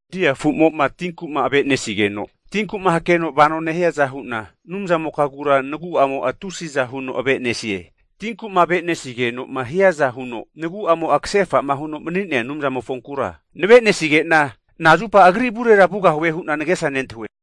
Dia afumo'ma tinku'ma ave'nesigeno tinku'ma hakeno vanoma nehiaza hu'na Anumzamokagura nagu'amo'a tusiza huno ave'nesie. Tinku'ma ave'nesigenoma hiaza huno nagu'amo'a kasefa'ma huno mani'nea Anumzamofonkura nave'nesige'na nazupa agri avurera vugahue hu'na nagesa nentahue.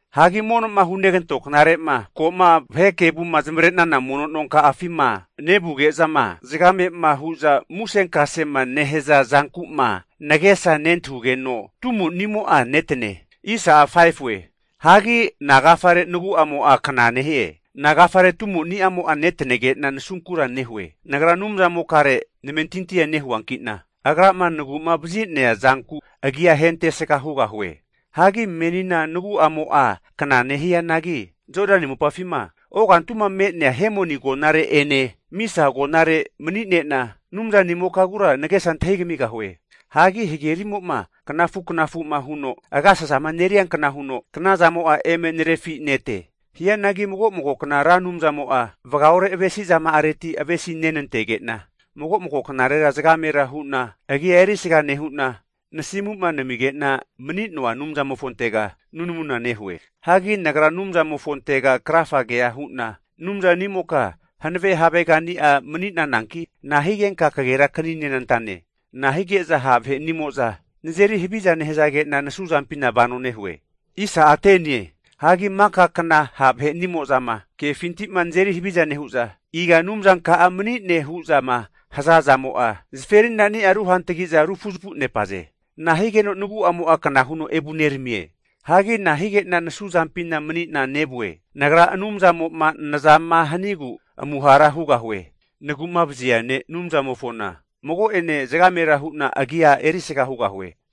Hagi mono'ma hunegantona knare'ma, ko'ma vahe kevuma zamavare'na mono nonka'afima, nevuge'zama zagamema hu'za musenkasema nehaza zanku'ma nagesa nentahugeno, tumonimo'a netanie. Hagi nagafare nagu'amo'a kna nehie? Nagafare tumo'nimo'a netanege'na nasunkura nehue? Nagra Anumzamokare namentintia nehuanki'na, Agrama nagu'mavazi'nea zanku agia ahentesga hugahue. Hagi menina nagu'amo'a kna nehianagi, Jodani mopafima ogantuma me'nea Hemoni agonare'ene Misa agonare mani'nena Anumzanimokagura nagesa antahimigahue. Hagi hagerimo'ma knafu knafu'ma huno agasasama neriankna huno, knazamo'a eme narefinete. Hianagi mago mago kna Ra Anumzamo'a vagaore avesizama'areti avesinentege'na, mago mago kenegera zagamera hu'na agia erisga nehu'na, nasimu'ma namige'nama mani'noa Anumzamofontega nunamuna nehue. Hagi nagra Anumzanimofontega krafagea hu'na, Anumzanimoka hankave havegani'a mani'nananki, nahigenka kagerakaninenantane? Na'a hige'za ha' vahenimo'za nazeri haviza nehazage'na nasuzampina vano nehue? Hagi maka kna ha' vahenimo'zama kefinti'ma nazeri haviza nehu'za, iga Anumzanka'a mani'ne hu'zama haza zamo'a zaferinani'a ruhantagi'za rufuzafunepaze. Nahigeno nagu'amo'a kna huno evuneramie? Hagi nahige'na nasuzampina mani'na nevue? Nagra Anumzamo'ma nazama hanigu amuhara hugahue! Nagu'mavazi ne', Anumzanimofona mago'ene zagamera hu'na agia erisga hugahie.